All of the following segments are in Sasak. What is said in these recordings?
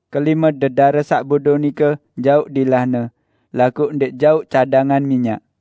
Kelime dedare saq bodo nike jauq dilahne, laguq ndẽq jauq cadangan minyak.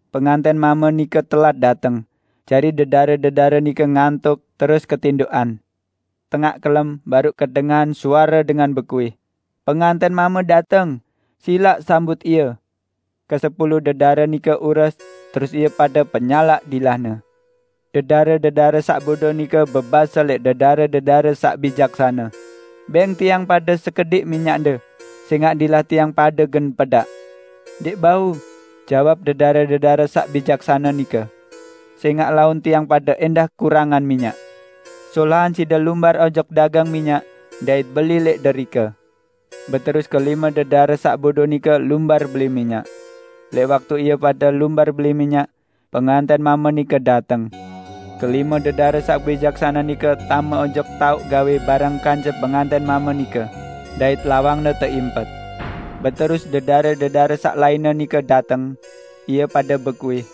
Pengantẽn mame nike telat dateng, jari dedare-dedare nike ngantok terus ketindoqan. Tengaq kelem, baruq kedengahan suare dengan bekuih, 'Pengantẽn mame dateng! Silaq sambut ie!' Kesepulu dedare nike ures, terus ie pade penyalaq dilahne. Dedare-dedare saq bodo nike bebase lẽq dedare-dedare saq bijaksane, 'Bẽng tiang pade sekediq minyakde, sẽngaq dilah tiang pade gen pedaq.' 'Ndẽq bau!' jawab dedare-dedare saq bijaksane nike, 'sẽngaq laun tiang pade ẽndah kurangan minyak. Solahan side lumbar ojok dagang minyak dait beli lẽq derike.' Beterus kelime dedare saq bodo nike lumbar beli minyak. Lẽq waktu ie pade lumbar beli minyak, pengantẽn mame nike dateng. Kelime dedare saq bijaksane nike tame ojok taoq gawẽ bareng kance pengantẽn mame nike, dait lawangne teimpet! Beterus dedare-dedare saq lainne nike dateng. Ie pade bekuih,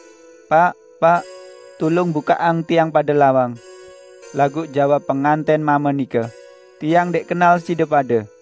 'Paq! Paq! Tulung bukaqang tiang pade lawang.' Laguq jawab pengantẽn mame nike, 'Tiang ndẽq kenal side pade!' "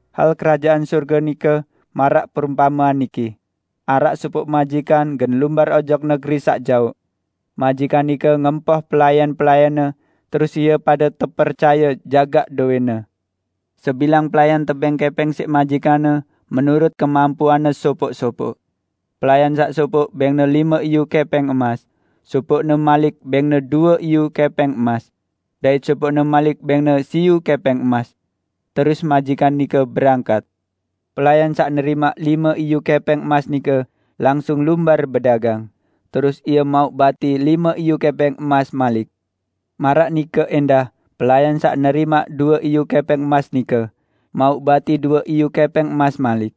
"Hal Kerajaan Sorge nike maraq perumpamean niki: Araq sopoq majikan gen lumbar ojok negeri saq jaoq. Majikan nike ngempoh pelayan-pelayanne, terus ie pade tepercaye jagaq dowẽnne. Sebilang pelayan tebẽng kẽpẽng siq majikanne menurut kemampuanne sopoq-sopoq. Pelayan saq sopoq bẽngne lime iyu kẽpẽng emas, sopoqne malik bẽngne due iyu kẽpẽng emas. Dait sopoqne malik bẽngne siyu kẽpẽng emas. Terus majikan nike berangkat. Pelayan saq nerimaq lime iyu kẽpẽng emas nike langsung lumbar bedagang, terus ie mauq bati lime iyu kẽpẽng emas malik. Maraq nike ẽndah pelayan saq nerimaq due iyu kẽpẽng emas nike, mauq bati due iyu kẽpẽng emas malik.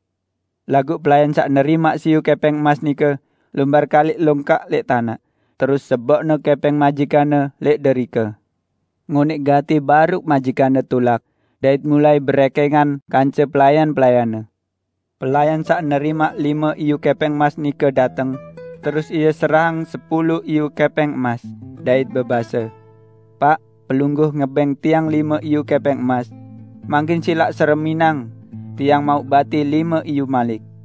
Laguq pelayan saq nerimaq siyu kẽpẽng emas nike lumbar kaliq longkak lẽq tanaq, terus seboqne kẽpẽng majikanne lẽq derike. Ngonẽq gati baruq majikanne tulak, dait mulai berẽkẽngan kance pelayan-pelayanne. Pelayan saq nerimaq lime iyu kẽpẽng emas nike dateng, terus ie serahang sepulu iyu kẽpẽng emas, dait bebase, 'Paq, pelungguh ngebẽng tiang lime iyu kẽpẽng emas. Mangkin silaq sereminang, tiang mauq bati lime iyu malik.'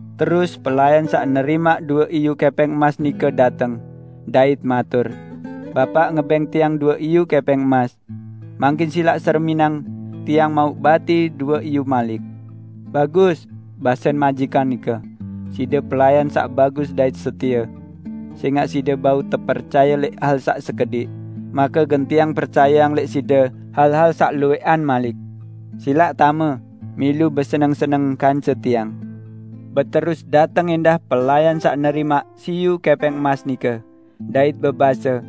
Terus pelayan saq nerimaq due iyu kẽpẽng emas nike dateng, dait matur, 'Bapaq ngebẽng tiang due iyu kẽpẽng emas. Mangkin silaq sereminang, tiang mauq bati due iyu malik.' 'Bagus,' basen majikan nike, 'side pelayan saq bagus dait setie. Sẽngaq side bau tepercaye lẽq hal saq sekediq, make gen tiang percayeang lẽq side hal-hal saq luwẽqan malik. Silaq tame, milu beseneng-seneng kance tiang!' Beterus dateng ẽndah pelayan saq nerimaq siyu kẽpẽng emas nike, dait bebase,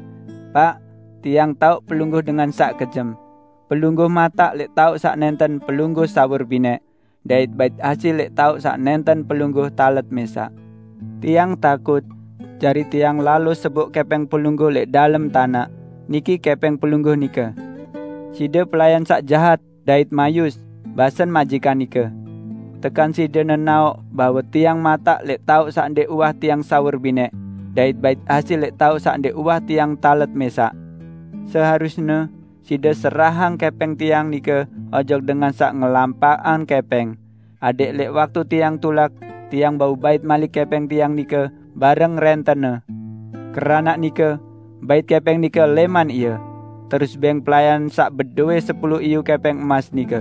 'Paq, tiang taoq pelungguh dengan saq kejem. Pelungguh mataq lẽq taoq saq nẽnten pelungguh sawur binẽq, dait bait hasil lẽq taoq saq nẽnten pelungguh talet mẽsaq. Tiang takut, jari tiang lalo seboq kẽpẽng pelungguh lẽq dalem tanaq. Niki kẽpẽng pelungguh nike.' 'Side pelayan saq jahat dait mayus!' basen majikan nike. 'Tekan side nenaoq bahwe tiang mataq lẽq taoq saq ndẽq uwah tiang sawur binẽq, dait bait hasil lẽq taoq saq ndẽq uwah tiang talet mẽsaq? Seharusne side serahang kẽpẽng tiang nike ojok dengan saq ngelampaqang kẽpẽng, adẽq lẽq waktu tiang tulak, tiang bau bait malik kẽpẽng tiang nike bareng rẽntenne. Keranaq nike, bait kẽpẽng nike lẽman ie, terus bẽng pelayan saq bedowẽ sepulu iyu kẽpẽng emas nike.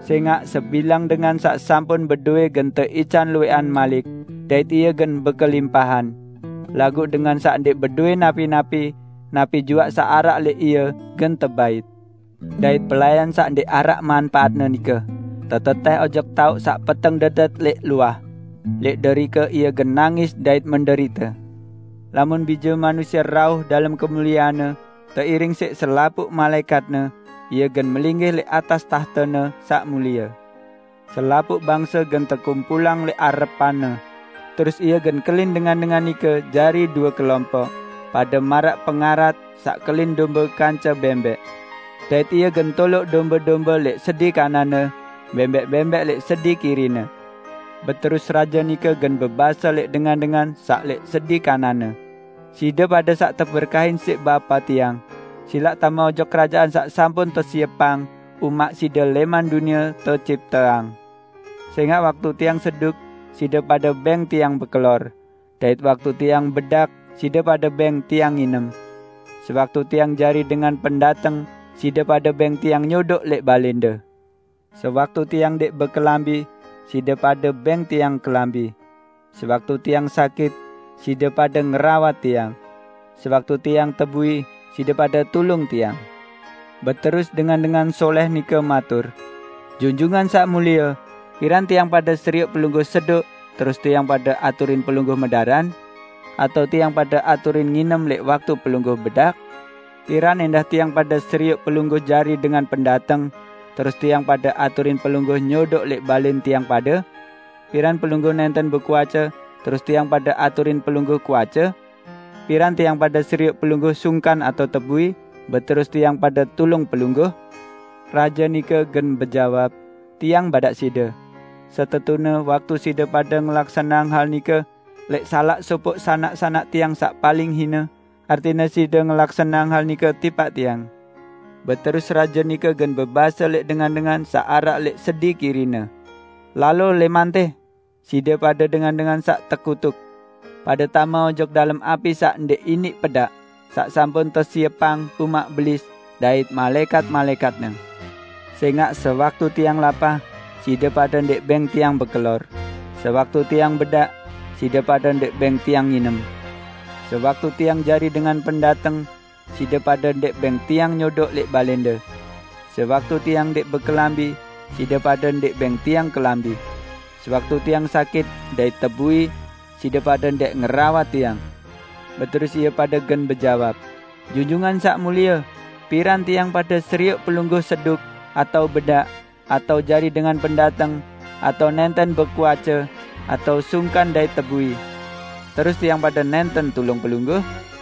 Sẽngaq sebilang dengan saq sampun bedowẽ gen teican luwẽqan malik, dait ie gen bekelimpahan. Laguq dengan saq ndẽq bedowẽ napi-napi, napi juaq saq araq lẽq ie gen tebait. Dait pelayan saq ndẽq araq manpaatne nike, tetetẽh ojok taoq saq peteng dedet lẽq luah. Lẽq derike ie gen nangis dait menderite!' " "Lamun Bije Manusie rauh dalem kemuliean-Ne teiring siq selapuq malaẽkat-Ne, Ie gen melinggih lẽq atas tahte-Ne saq mulie. Selapuq bangse gen tekumpulang lẽq arepan-Ne. Terus Ie gen kelin dengan-dengan nike jari due kelompoq, pade maraq pangarat saq kelin dombe kance bẽmbẽq. Dait Ie gen toloq dombe-dombe lẽq sedi kanan-Ne, bẽmbẽq-bẽmbẽq lẽq sedi kiri-Ne. Beterus Raje nike gen bebase lẽq dengan-dengan saq lẽq sedi kanan-Ne, 'Side pade saq teberkahin siq Bapa Tiang, silaq tame ojok Kerajaan saq sampun tesiepang umaq side lẽman dunie tecipteang. Sẽngaq waktu Tiang seduk, side pade bẽng Tiang bekelor, dait waktu Tiang bedak, side pade bẽng Tiang nginem. Sewaktu Tiang jari dengan pendateng, side pade bẽng Tiang nyodoq lẽq balẽnde. Sewaktu Tiang ndẽq bekelambi, side pade bẽng Tiang kelambi. Sewaktu Tiang sakit, side pade ngerawat Tiang. Sewaktu Tiang tebui, side pade tulung Tiang.' Beterus dengan-dengan solẽh nike matur, 'Junjungan Saq Mulie, piran tiang pade serioq Pelungguh seduk terus tiang pade aturin Pelungguh medaran? Atao tiang pade aturin nginem lẽq waktu Pelungguh bedak? Piran ẽndah tiang pade serioq Pelungguh jari dengan pendateng, terus tiang pade aturin Pelungguh nyodoq lẽq balẽn tiang pade? Piran Pelungguh nẽnten bekuace, terus tiang pade aturin Pelungguh kuace? Piran tiang pade serioq Pelungguh sungkan atao tebui, beterus tiang pade tulung Pelungguh?' Raje nike gen bejawab, 'Tiang badaq side: Setetune waktu side pade ngelaksaneang hal nike lẽq salaq sopoq sanak-sanak Tiang saq paling hine, artine side ngelaksaneang hal nike tipaq Tiang!' Beterus Raje nike gen bebase lẽq dengan-dengan saq araq lẽq sedi kiri-Ne, 'Lalo lẽman tẽ, side pade dengan-dengan saq tekutuk! Pade tame ojok dalem api saq ndẽq iniq pedaq saq sampun tesiepang umaq Belis dait malaẽkat-malaẽkatne! Sẽngaq sewaktu Tiang lapah, side pade ndẽq bẽng Tiang bekelor; sewaktu Tiang bedak, side pade ndẽq bẽng Tiang nginem. Sewaktu Tiang jari dengan pendateng, side pade ndẽq bẽng Tiang nyodoq lẽq balẽnde. Sewaktu Tiang ndẽq bekelambi, side pade ndẽq bẽng Tiang kelambi. Sewaktu Tiang sakit dait tebui side pade ndẽq ngerawat Tiang.' Beterus ie pade gen bejawab, 'Junjungan Saq Mulie, piran tiang pade serioq Pelungguh seduk, atao bedak, atao jari dengan pendateng, atao nẽnten bekuace atao sungkan dait tebui? Terus tiang pade nẽnten tulung Pelungguh?'